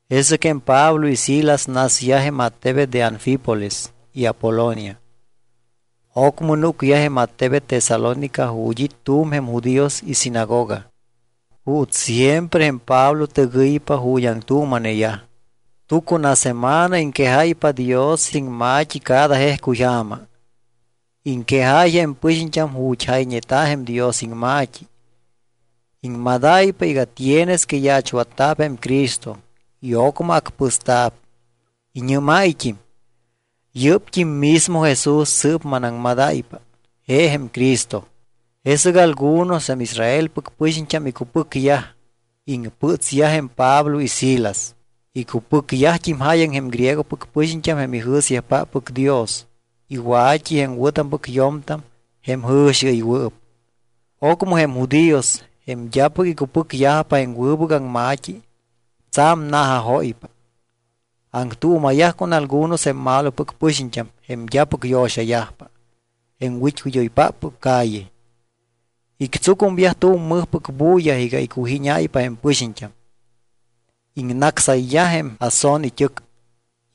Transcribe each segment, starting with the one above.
Jesɨc jém Pablo y Silas nasyaj jém attebet de Anfípolis y Apolonia. Ocmɨ núcyaj jém attebet Tesalónica ju̱t́ it́ tu̱m jém judíos isinagoga. Juuts siempre jém Pablo tɨgɨypa ju̱t́ aŋtuuma̱neyaj. Tucunasemana iŋquejáypa Dios iŋma̱t́i cada jejcuyja̱ma. Iŋquejáy jém pɨxiñt́am ju̱t́ jayñeta̱ jém Dios iŋma̱t́i. Iŋmadáypa iga tienes que yaachwatta̱p jém Cristo y ocmɨ acpɨsta̱p. Iñɨ́máyt́im: —Yɨ́pt́im mismo Jesús sɨɨp manaŋmadáypa, je jém Cristo. Jesɨc algunos jém Israelpɨc pɨxiñt́am icupɨcyaj, iŋpɨtsyaj jém Pablo y Silas. Icupɨcyajt́im jáyaŋ jém griegopɨc pɨxiñt́am jém ijɨ̱syajpáppɨc Dios y wa̱t́i jém wɨ̱tampɨc yo̱mtam jém jɨ̱xiɨywɨɨp. Ocmɨ jém judíos, jém d́apɨc icupɨcyajpa jém wɨbɨc aŋma̱t́i, tsa̱m na̱jajóypa. Aŋtuuma̱yaj con algunos jém malopɨc pɨxiñt́am jém d́apɨc yo̱xayajpa, jém wit́wid́oypáppɨc calle. Ictsucumyaj tu̱m mɨjpɨc bulla iga iccujíñáypa jém pɨxiñt́am. Iŋnácsayyaj jém Jasón it́ɨc.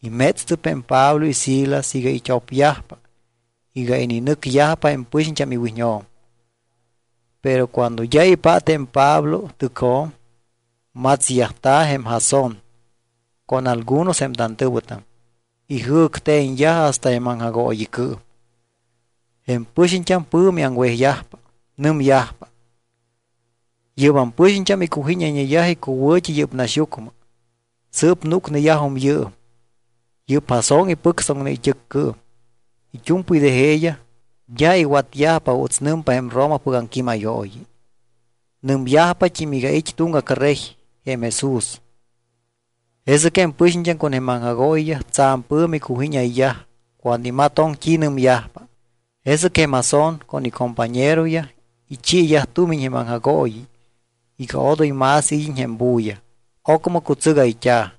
Imétstɨp jém Pablo y Silas iga it́opyajpa iga ininɨcyajpa jém pɨxiñt́am iwiñjo̱m. Pero cuando d́a ipát jém Pablo tɨcjo̱m, matsyajta̱ jém Jasón con algunos jém tantɨ̱wɨtam. Ijɨ̱cte̱ñyaj hasta jém aŋjagooyicɨɨm. Jém pɨxiñt́am pɨ̱mi aŋwejyajpa. Nɨmyajpa: —Yɨ́bam pɨxiñt́am iccujíñayñeyaj icuwɨ̱t́i yɨ́p naxyucmɨ. Sɨɨp núcneyajum yɨɨm. Yɨ́p Jasón ipɨctsoŋne it́ɨccɨɨm. It́u̱mpɨy de jeeyaj d́a iwatyajpa juuts nɨmpa jém Romapɨc aŋquímayooyi. Nɨmyajpat́im iga it́ tuŋgac rey, jém Jesús. Jesɨc jém pɨxiñt́am con jém aŋjagooyiyaj tsa̱m pɨ̱mi cujíñayyaj cuando imatoŋ t́i nɨmyajpa. Jesɨc jém Jasón con icompañeroyaj ichiiyaj tumiñ jém aŋjagooyi iga odoy más id́iñ jém bulla. Ocmɨ cutsɨgayt́a̱.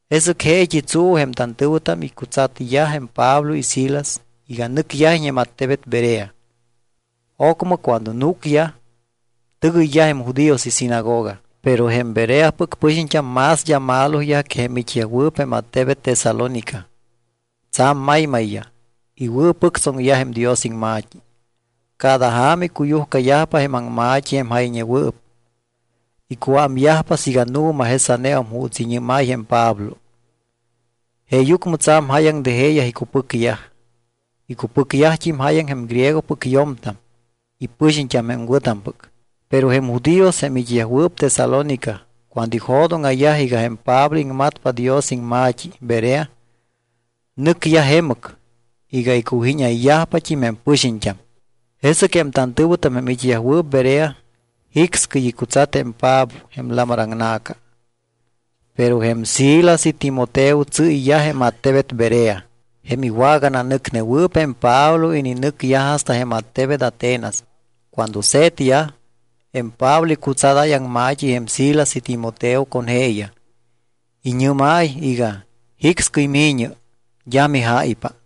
Jesɨc jeet́i tsuu jém tantɨ̱wɨtam icutsatyaj jém Pablo y Silas iga nɨcyajiñ jém attebet Berea. Ocmɨ cuando núcyaj, tɨgɨyyaj jém judíos isinagoga. Pero jém Bereapɨc pɨxiñt́am más d́a maloyaj que jém it́yajwɨɨp jém attebet Tesalónica. Tsa̱m maymayyaj, iwɨ̱pɨctsoŋyaj jém Dios iŋma̱t́i. Cada ja̱ma icuyujcayajpa jém aŋma̱t́i jém jayñewɨɨp, icuámyajpa siiga nu̱ma jesaneum juuts iñɨ́máy jém Pablo. Jeeyucmɨ tsa̱m jáyaŋ de jeeyaj icupɨcyaj. Icupɨcyajt́im jáyaŋ jém griegopɨc yo̱mtam y pɨxiñt́am jém wɨ̱tampɨc. Pero jém judíos jém it́yajwɨɨp Tesalónica, cuando ijo̱dóŋa̱yaj iga jém Pablo iŋmatpa Dios iŋma̱t́i Berea, nɨcyaj jemɨc iga iccujíñayyajpat́im jém pɨxiñt́am. Jesɨc jém tantɨ̱wɨtam jém it́yajwɨɨp Berea jicscɨy icutsat jém Pablo jém lamar aŋna̱ca. Pero jém Silas y Timoteo tsɨ́yyaj jém attebet Berea. Jém iwagananɨcnewɨɨp jém Pablo ininɨcyaj hasta jém attebet Atenas. Cuando se̱tyaj, jém Pablo icutsadáy aŋma̱t́i jém Silas y Timoteo con jeeyaj. Iñɨ́máy iga: Jicscɨy mi̱ñɨ, d́a mijáypa.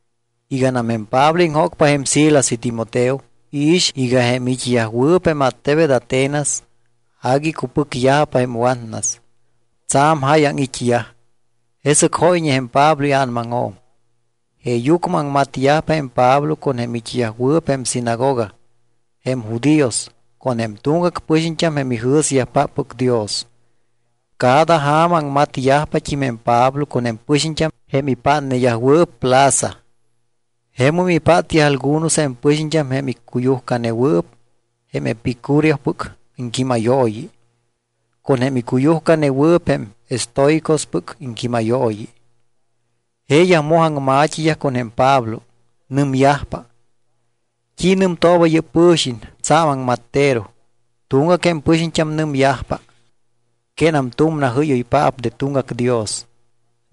Iganam jém Pablo iŋjócpa jém Silas y Timoteo, iix iga jém it́yajwɨɨp jém attebet Atenas agui icupɨcyajpa jém watnas. Tsa̱m jáyaŋ it́yaj. Jesɨc jóyñe jém Pablo ia̱namajo̱m. Jeeyucmɨ aŋmatyajpa jém Pablo con jém it́yajwɨɨp jém sinagoga, jém judíos, con jém tuŋgac pɨxiñt́am jém ijɨ̱syajpáppɨc Dios. Cada ja̱ma aŋmatyajpat́im jém Pablo con jém pɨxiñt́am jém ipátneyajwɨɨp plaza. Jemum ipátyaj algunos jém pɨxiñt́am jém icuyujcanewɨɨp jém epicúreospɨc iŋquímayooyi con jém icuyujcanewɨɨp jém estoicospɨc iŋquímayooyi. Jeeyaj moj aŋma̱t́iyaj con jém Pablo. Nɨmyajpa: —¿T́i nɨmtooba yɨ́p pɨ̱xiñ tsa̱m aŋmattero? Tuŋgac jém pɨxiñt́am nɨmyajpa: —Quénam tu̱m najɨ́yoypaap de tuŋgac dios.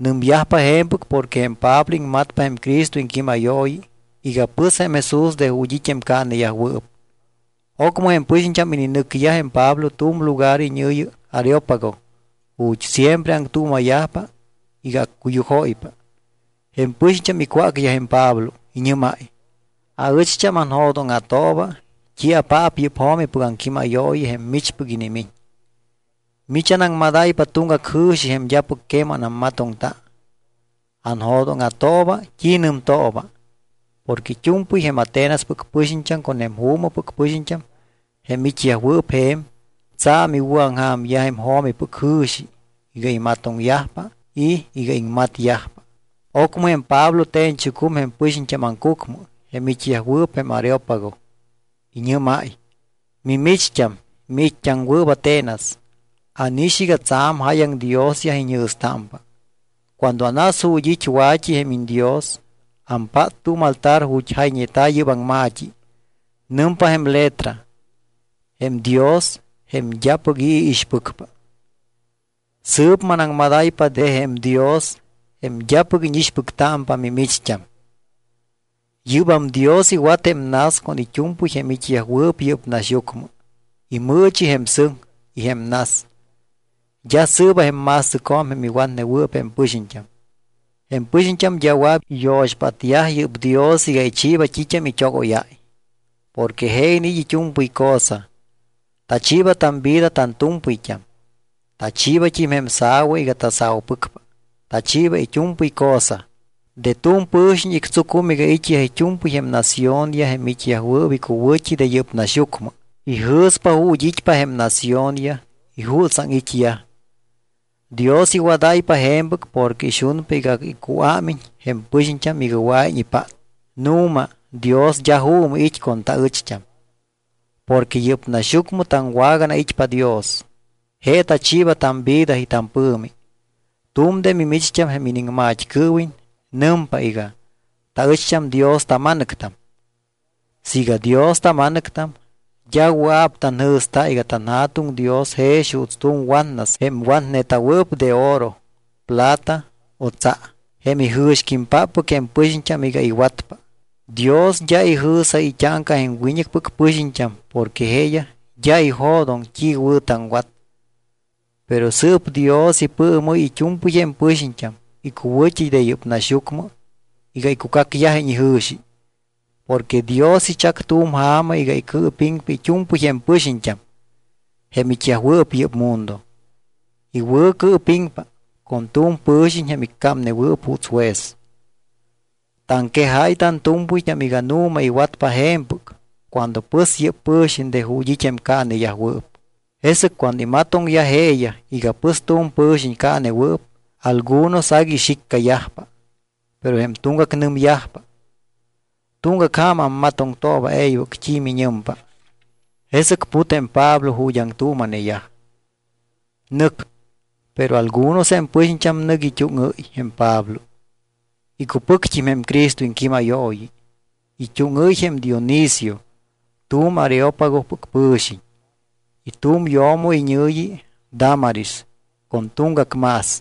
Nɨmyajpa je̱mpɨc porque jém Pablo iŋmatpa jém Cristo iŋquímayooyi iga pɨs jém Jesús de ju̱t́ it́ jém caaneyajwɨɨp. Ocmɨ jém pɨxiñt́am ininɨcyaj jém Pablo tu̱m lugar iñɨ̱yi Areópago ju̱t́ siempre aŋtuuma̱yajpa iga accuyujóypa. Jém pɨxiñt́am icwácyaj jém Pablo. Iñɨ́máy: —Aɨcht́am anjo̱dóŋa̱tooba t́iapaap yɨ́p jo̱mipɨc aŋquímayooyi jém michpɨc inimiñ. Mich anaŋmadáypa tuŋgac jɨ̱xi jém d́apɨc queman ammatoŋta. Anjo̱dóŋa̱tooba t́i nɨmtooba. Porque it́u̱mpɨy jém Atenaspɨc pɨxiñt́am con jém juumɨpɨc pɨxiñt́am jém it́yajwɨɨp je̱m, tsa̱m iwɨ̱aŋja̱myaj jém jo̱mipɨc jɨ̱xi iga imatoŋyajpa y iga iŋmatyajpa. Ocmɨ jém Pablo te̱ñchucum jém pɨxiñt́am aŋcucmɨ jém it́yajwɨɨp jém Areópago. Iñɨ́máy: —Mimicht́am, miit́t́aŋwɨɨp Atenas. Ánix iga tsa̱m jáyaŋ diosyaj iñjɨ̱stámpa. Cuando anas ju̱t́ it́ wa̱t́i jém iñdios, ampát tu̱m altar ju̱t́ jayñeta̱ yɨ́p aŋma̱t́i. Nɨmpa jém letra: “Jém dios jém d́apɨc i̱ iixpɨcpa.” Sɨɨp manaŋmadáypa de jém Dios, jém d́apɨc íñixpɨctámpa mimicht́am. ’Yɨ́bam Dios iwat jém nas con it́u̱mpɨy jém it́yajwɨɨp yɨ́p naxyucmɨ. Imɨɨchi jém sɨŋ y jém nas. D́a sɨɨba jém ma̱stɨcjo̱m jém iwatnewɨɨp jém pɨxiñt́am. Jém pɨxiñt́am d́a wɨa̱p iyo̱xpátyaj yɨ́p Dios iga ichiiba t́it́am it́ogóyáy. Porque je iniit́ it́u̱mpɨy cosa. Tachiiba tamvida tantu̱mpɨyt́am. Tachiibat́im jém sa̱wa iga tasa̱upɨcpa. Tachiiba it́u̱mpɨy cosa. ’De tu̱m pɨ̱xiñ ictsucum iga it́yaj it́u̱mpɨy jém naciónyaj jém it́yajwɨɨp icuwɨ̱t́i de yɨ́p naxyucmɨ. Ijɨ̱spa ju̱t́ it́pa jém naciónyaj y jutsaŋ it́yaj. Dios iwadáypa je̱mpɨc porque ixunpa iga icuámiñ jém pɨxiñt́am iga wɨa̱iñ ipát. Nu̱ma Dios d́a juumɨ it́ con taɨcht́am. Porque yɨ́p naxyucmɨ taŋwaganait́pa Dios. Je tachiiba tamvida y tampɨ̱mi. Tu̱m de mimicht́am jém iniŋmat́cɨɨwiñ nɨmpa iga: “Taɨcht́am Dios tama̱nɨctam.” Siiga Dios tama̱nɨctam, d́a wɨa̱p tanjɨ̱sta iga tanJa̱tuŋ Dios jex juuts tu̱m watnas jém watneta̱wɨɨp de oro, plata o tsa, jém ijɨ̱xquímpáppɨc jém pɨxiñt́am iga iwatpa. Dios d́a ijɨ̱sáy it́áŋca jém wiñɨcpɨc pɨxiñt́am porque jeeyaj d́a ijo̱doŋ t́i wɨ̱ taŋwat. Pero sɨɨp Dios ipɨɨmɨ́y it́u̱mpɨy jém pɨxiñt́am icuwɨ̱t́i de yɨ́p naxyucmɨ iga icucacyajiñ ijɨ̱xi. Porque Dios ichac tu̱m ja̱ma iga icɨɨpiŋpa it́u̱mpɨy jém pɨxiñt́am, jém it́yajwɨɨp yɨ́p mundo. Iwɨ̱cɨɨpiŋpa con tu̱m pɨ̱xiñ jém iccámnewɨɨp juuts juez. Taŋquejáy tantu̱mpɨyt́am iga nu̱ma iwatpa je̱mpɨc cuando pɨs yɨ́p pɨ̱xiñ de ju̱t́ it́ jém caaneyajwɨɨp. Jesɨc cuando imatoŋyaj jeeyaj iga pɨs tu̱m pɨ̱xiñ caanewɨɨp, algunos agui ixiccayajpa. Pero jém tuŋgac nɨmyajpa: —Tuŋgac ja̱ma ammatoŋtooba e̱ybɨc t́i miñɨmpa. Jesɨc put jém Pablo ju̱t́ aŋtuuma̱neyaj. Nɨc. Pero algunos jém pɨxiñt́am nɨc it́úŋɨ́y jém Pablo. Icupɨct́im jém Cristo iŋquímayooyi. It́úŋɨ́y jém Dionisio tu̱m Areópagopɨc pɨ̱xiñ, y tu̱m yo̱mo iñɨ̱yi Dámaris con tuŋgac más.